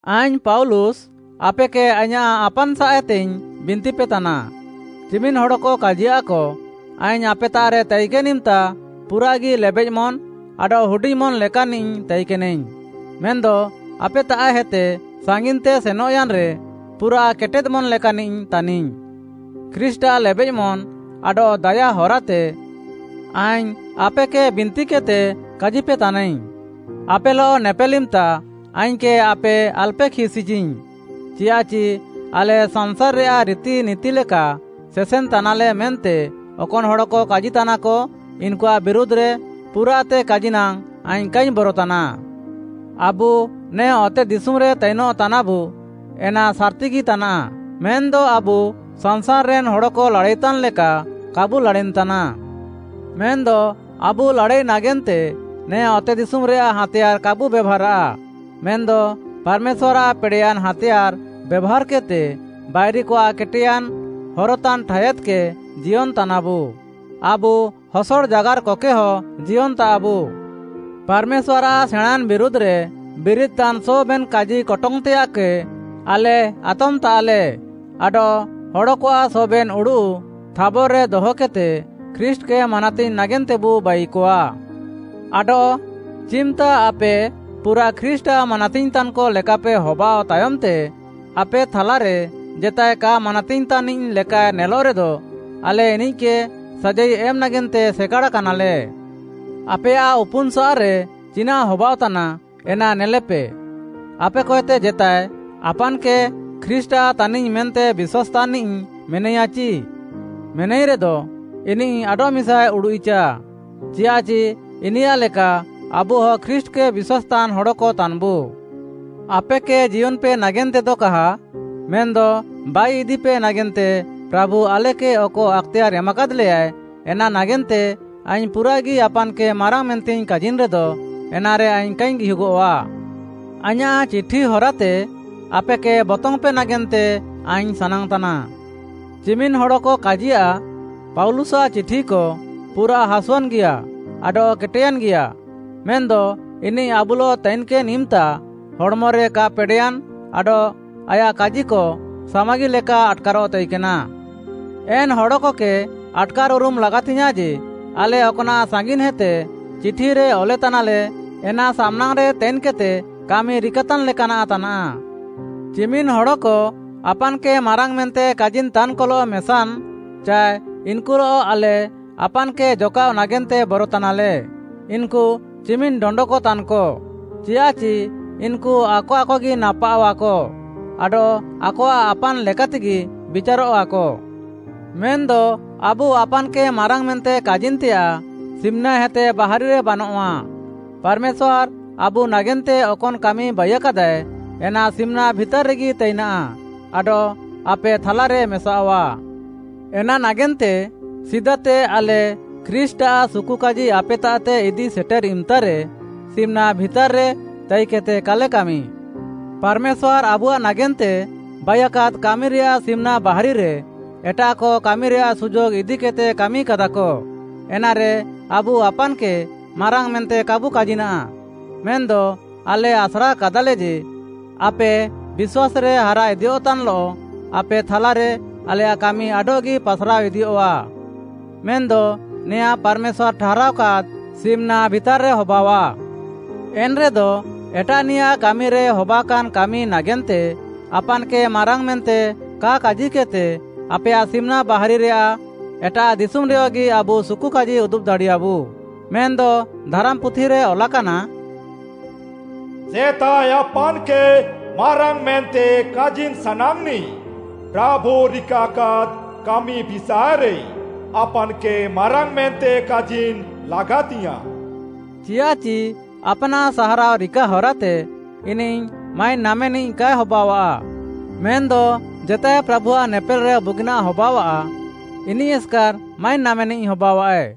ଆଇଙ୍ଗ୍‌ ପାଉଲୁସ୍‌, ଆପେକେ ଆଇଁୟାଃ ଆପାନ୍‌ସାଃଏତେଇଙ୍ଗ୍‌ ବିନ୍ତିପେତାନା, ଚିମିନ୍‌ ହଡ଼କ କାଜିୟାଃକ, “ଆଇଙ୍ଗ୍‌ ଆପେତାଃରେ ତାଇକେନ୍‌ ଇମ୍‌ତା ପୁରାଃଗି ଲେବେଃମନ୍‌ ଆଡଃ ହୁଡିଙ୍ଗ୍‌ମନ୍‌ ଲେକାନ୍‌ନିଃ ତାଇକେନାଇଙ୍ଗ୍‌, ମେନ୍‌ଦ ଆପେତାଃହେତେ ସାଙ୍ଗିନ୍‌ତେ ସେନଃୟାନ୍‌ରେ ପୁରାଃ କେଟେଦ୍‌ମନ୍‌ ଲେକାନ୍‌ନିଃ ତାନିଙ୍ଗ୍‌।” ଖ୍ରୀଷ୍ଟ୍‌ଆଃ ଲେବେଃମନ୍‌ ଆଡଃ ଦାୟା ହରାତେ ଆଇଙ୍ଗ୍‌ ଆପେକେ ବିନ୍ତିକେଦ୍‌ତେ କାଜିପେତାନାଇଙ୍ଗ୍‌, ଆପେଲଃ ନେପେଲ୍‌ ଇମ୍‌ତା ଆଇଙ୍ଗ୍‌କେ ଆପେ ଆଲ୍‌ପେ ଖିସ୍‌ଇଚିଙ୍ଗ୍‌, ଚିୟାଃଚି ଆଲେ ସାଂସାର୍‌ରେୟାଃ ରିତିନିତି ଲେକା ସେସେନ୍‌ତାନାଲେ ମେନ୍ତେ ଅକନ୍‌ ହଡ଼କ କାଜିତାନାକ, ଇନ୍‌କୁଆଃ ବିରୁଧ୍‌ରେ ପୁରାଃତେ କାଜିନାଙ୍ଗ୍‌ ଆଇଙ୍ଗ୍‌ କାଇଙ୍ଗ୍‌ ବରତାନା। ଆବୁ ନେ ଅତେଦିଶୁମ୍‌ରେ ତାଇନଃ ତାନାବୁ ଏନା ସାର୍‌ତିଗି ତାନାଃ, ମେନ୍‌ଦ ଆବୁ ସାଂସାର୍‌ରେନ୍‌ ହଡ଼କ ଲାଡ଼ାଇତାନ୍‌ ଲେକା, କାବୁ ଲାଡ଼ାଇନ୍‌ତାନା। ମେନ୍‌ଦ ଆବୁ ଲାଡ଼ାଇ ନାଗେନ୍ତେ ନେ ଅତେଦିଶୁମ୍‌ରେୟାଃ ହାଁତେୟାର୍‌ କାବୁ ବେଭାର୍‌ଆଃ, ମେନ୍‌ଦ ପାର୍‌ମେଶ୍ୱାର୍‌ଆଃ ପେଡ଼େଃୟାନ୍‌ ହାଁତେୟାର୍‌ ବେଭାର୍‌କେଦ୍‌ତେ ବାଇରିକଆଃ କେଟେୟାନ୍‌ ହରତାନ୍‌ ଠାୟାଦ୍‌କେ ଜିୟନ୍‌ତାନାବୁ। ଆବୁ ହସଡ଼ ଜାଗାର୍‌କକେହ ଜିୟନ୍‌ତାଃବୁ। ପାର୍‌ମେଶ୍ୱାର୍‌ଆଃ ସେଣାଁଁନ୍‌ ବିରୁଧ୍‌ରେ ବିରିଦ୍‌ତାନ୍‌ ସବେନ୍‌ କାଜିକଟଙ୍ଗ୍‌ତେୟାଃକେ ଆଲେ ଆତମ୍‌ତାଃଲେ ଆଡଃ ହଡ଼କଆଃ ସବେନ୍‌ ଉଡ଼ୁଃ ଥାବର୍‌ରେ ଦହକେଦ୍‌ତେ ଖ୍ରୀଷ୍ଟ୍‌କେ ମାନାତିଙ୍ଗ୍‌ ନାଗେନ୍ତେବୁ ବାଇକଆ। ଆଡଃ ଚିମ୍‌ତା ଆପେ ପୁରା ଖ୍ରୀଷ୍ଟ୍‌ଆଃ ମାନାତିଙ୍ଗ୍‌ତାନ୍‌କ ଲେକାପେ ହବାଅଃ ତାୟମ୍‌ତେ, ଆପେ ଥାଲାରେ ଜେତାଏ କା ମାନାତିଙ୍ଗ୍‌ତାନ୍‌ନିଃ ଲେକାଏ ନେଲଃରେ, ଆଲେ ଇନିଃକେ ସାଜାଇ ଏମ୍‌ ନାଗେନ୍ତେ ସେକାଡ଼ାକାନାଲେ। ଆପେୟାଃ ଉପୁନ୍‌ସାଃରେ ଚିନାଃ ହବାଅଃତାନା, ଏନା ନେଲେପେ। ଆପେକଏତେ ଜେତାଏ, ଆପାନ୍‌କେ ଖ୍ରୀଷ୍ଟ୍‌ଆଃ ତାନିଙ୍ଗ୍‌ ମେନ୍ତେ ବିଶ୍ୱାସ୍‌ତାନ୍‌ନିଃ ମେନାଇୟାଚି? ମେନାଇରେଦ, ଇନିଃ ଆଡଃମିସାଏ ଉଡ଼ୁଃଇଚା, ଚିୟାଃଚି ଇନିୟାଃ ଲେକା ଆବୁହ ଖ୍ରୀଷ୍ଟ୍‌କେ ବିଶ୍ୱାସ୍‌ତାନ୍‌ ହଡ଼କ ତାନ୍‌ବୁ। ଆପେକେ ଜିୟନ୍‌ପେ ନାଗେନ୍ତେଦ କାହା, ମେନ୍‌ଦ ବାଇଇଦିପେ ନାଗେନ୍ତେ ପ୍ରାଭୁ ଆଲେକେ ଅକ ଆକ୍‌ତେୟାର୍‌ ଏମାକାଦ୍‌ଲେୟାଏ, ଏନା ନାଗେନ୍ତେ ଆଇଙ୍ଗ୍‌ ପୁରାଃଗି ଆପାନ୍‌କେ ମାରାଙ୍ଗ୍‌ ମେନ୍ତେଇଙ୍ଗ୍‌ କାଜିନ୍‌ରେଦ, ଏନାରେ ଆଇଙ୍ଗ୍‌ କାଇଙ୍ଗ୍‌ ଗିହୁଗଃଆ। ଆଇଁୟାଃ ଚିଠି ହରାତେ ଆପେକେ ବତଙ୍ଗ୍‌ପେ ନାଗେନ୍ତେ ଆଇଙ୍ଗ୍‌ ସାନାଙ୍ଗ୍‌ତାନା। ଚିମିନ୍‌ ହଡ଼କ କାଜିୟାଃ, “ପାଉଲୁସ୍‌ଆଃ ଚିଠିକ ପୁରାଃ ହାସୁଆନ୍‌ଗିଆ ଆଡଃ କେଟେୟାନ୍‌ଗିୟା, ମେନ୍‌ଦ ଇନିଃ ଆବୁଲଃ ତାଇକେନ୍‌ ଇମ୍‌ତା ହଡ଼୍‌ମରେ କା ପେଡ଼େୟାନ୍‌ ଆଡଃ ଆୟାଃ କାଜିକ ସାମାଗି ଲେକା ଆଟ୍‌କାରଃ ତାଇକେନା।” ଏନ୍‌ ହଡ଼କକେ ଆଟ୍‌କାର୍‌ ଉରୁମ୍‌ ଲାଗାତିଙ୍ଗ୍‌ୟାଁଃ ଯେ, ଆଲେ ଅକ୍‌ନାଃ ସାଙ୍ଗିନ୍‌ହେତେ ଚିଠିରେ ଅଲେତାନାଲେ, ଏନା ସାମ୍‌ନାଙ୍ଗ୍‌ରେ ତାଇନ୍‌କେଦ୍‌ତେ କାମି ରିକାତାନ୍‌ ଲେକାନାଃ ତାନାଃ। ଚିମିନ୍‌ ହଡ଼କ ଆପାନ୍‌କେ ମାରାଙ୍ଗ୍‌ ମେନ୍ତେ କାଜିନ୍‌ତାନ୍‌କଲଃ ମେସାନ୍‌ ଚାଏ ଇନ୍‌କୁଲଃ ଆଲେ ଆପାନ୍‌କେ ଜକାଃଅ ନାଗେନ୍ତେ ବରତାନାଲେ। ଇନ୍‌କୁ ଚିମିନ୍‌ ଡଣ୍ଡକ ତାନ୍‌କ, ଚିୟାଃଚି ଇନ୍‌କୁ ଆକ ଆକଗି ନାପାଅଃଆକ, ଆଡଃ ଆକଆଃ ଆପ୍‌ନାଃ ଲେକାତେଗି ବିଚାରଃଆକ। ମେନ୍‌ଦ ଆବୁ ଆପାନ୍‌କେ ମାରାଙ୍ଗ୍‌ ମେନ୍ତେ କାଜିନ୍‌ତେୟାଃ ସିମ୍‌ନାହେତେ ବାହାରିରେ ବାନଃଆ, ପାର୍‌ମେଶ୍ୱାର୍‌ ଆବୁ ନାଗେନ୍ତେ ଅକନ୍‌ କାମି ବାଇୟାକାଦାଏ, ଏନା ସିମ୍‌ନା ଭିତାର୍‌ରେଗି ତାଇନା ଆଡଃ ଆପେ ଥାଲାରେ ମେସାଅଃଆ। ଏନା ନାଗେନ୍ତେ ସିଦାତେ ଆଲେ ଖ୍ରୀଷ୍ଟ୍‌ଆଃ ସୁକୁକାଜି ଆପେତାଃତେ ଇଦି ସେଟେର୍‌ ଇମ୍‌ତାରେ ସିମ୍‌ନା ଭିତାର୍‌ରେ ତାଇକେଦ୍‌ତେ କାଲେ କାମି। ପାର୍‌ମେଶ୍ୱାର୍‌ ଆବୁଆଃ ନାଗେନ୍ତେ ବାଇୟାକାଦ୍‌ କାମିରେୟାଃ ସିମ୍‌ନା ବାହାରିରେ ଏଟାଃକ କାମିରେୟାଃ ସୁଯୋଗ୍‌ ଇଦିକେଦ୍‌ତେ କାମିକାଦାକ, ଏନାରେ ଆବୁ ଆପାନ୍‌କେ ମାରାଙ୍ଗ୍‌ ମେନ୍ତେ କାବୁ କାଜିନା। ମେନ୍‌ଦ ଆଲେ ଆସ୍ରାକାଦାଲେ ଯେ, ଆପେ ବିଶ୍ୱାସ୍‌ରେ ହାରା ଇଦିୟଃତାନ୍‌ଲଃ ଆପେ ଥାଲାରେ ଆଲେୟାଃ କାମି ଆଡଃଗି ପାସ୍‌ରାଅ ଇଦିଅଃଆ। ମେନ୍‌ଦ ନେଆଁଁ ପାର୍‌ମେଶ୍ୱାର୍‌ ଠାହାରାଅକାଦ୍‌ ସିମ୍‌ନା ଭିତାର୍‌ରେ ହବାଅଃଆ। ଏନ୍‌ରେଦ, ଏଟାଃନିୟାଃ କାମିରେ ହବାକାନ୍‌ କାମି ନାଗେନ୍ତେ ଆପାନ୍‌କେ ମାରାଙ୍ଗ୍‌ ମେନ୍ତେ କା କାଜିକେଦ୍‌ତେ ଆପେୟାଃ ସିମ୍‌ନା ବାହାରିରେୟାଃ ଏଟାଃ ଦିଶୁମ୍‌ରେୟଗି ଆବୁ ସୁକୁକାଜି ଉଦୁବ୍‌ ଦାଡ଼ିୟାବୁ। ମେନ୍‌ଦ ଧାରାମ୍‌ପୁଥିରେ ଅଲାକାନା, “ଜେତାଏ ଆପାନ୍‌କେ ମାରାଙ୍ଗ୍‌ ମେନ୍ତେ କାଜିନ୍‌ ସାନାଙ୍ଗ୍‌ନିଃ, ପ୍ରାଭୁ ରିକାକାଦ୍‌ କାମି ବିଷାଏରେ ଆପାନ୍‌କେ ମାରାଙ୍ଗ୍‌ ମେନ୍ତେ କାଜିନ୍‌ ଲାଗାତିଙ୍ଗ୍‌ୟାଁଃ।” ଚିୟାଃଚି ଆପ୍‌ନାଃ ସାହାରାଅ ରିକା ହରାତେ, ଇନିଃ ମାଇନ୍‌ ନାମେନିଃ କାଏ ହବାଅଃଆ, ମେନ୍‌ଦ ଜେତାଏ ପ୍ରାଭୁଆଃ ନେପେଲ୍‌ରେ ବୁଗିନାଃ ହବାଅଃଆ, ଇନିଃ ଏସ୍‌କାର୍‌ ମାଇନ୍‌ ନାମେନିଃ ହବାଅଃଆଏ।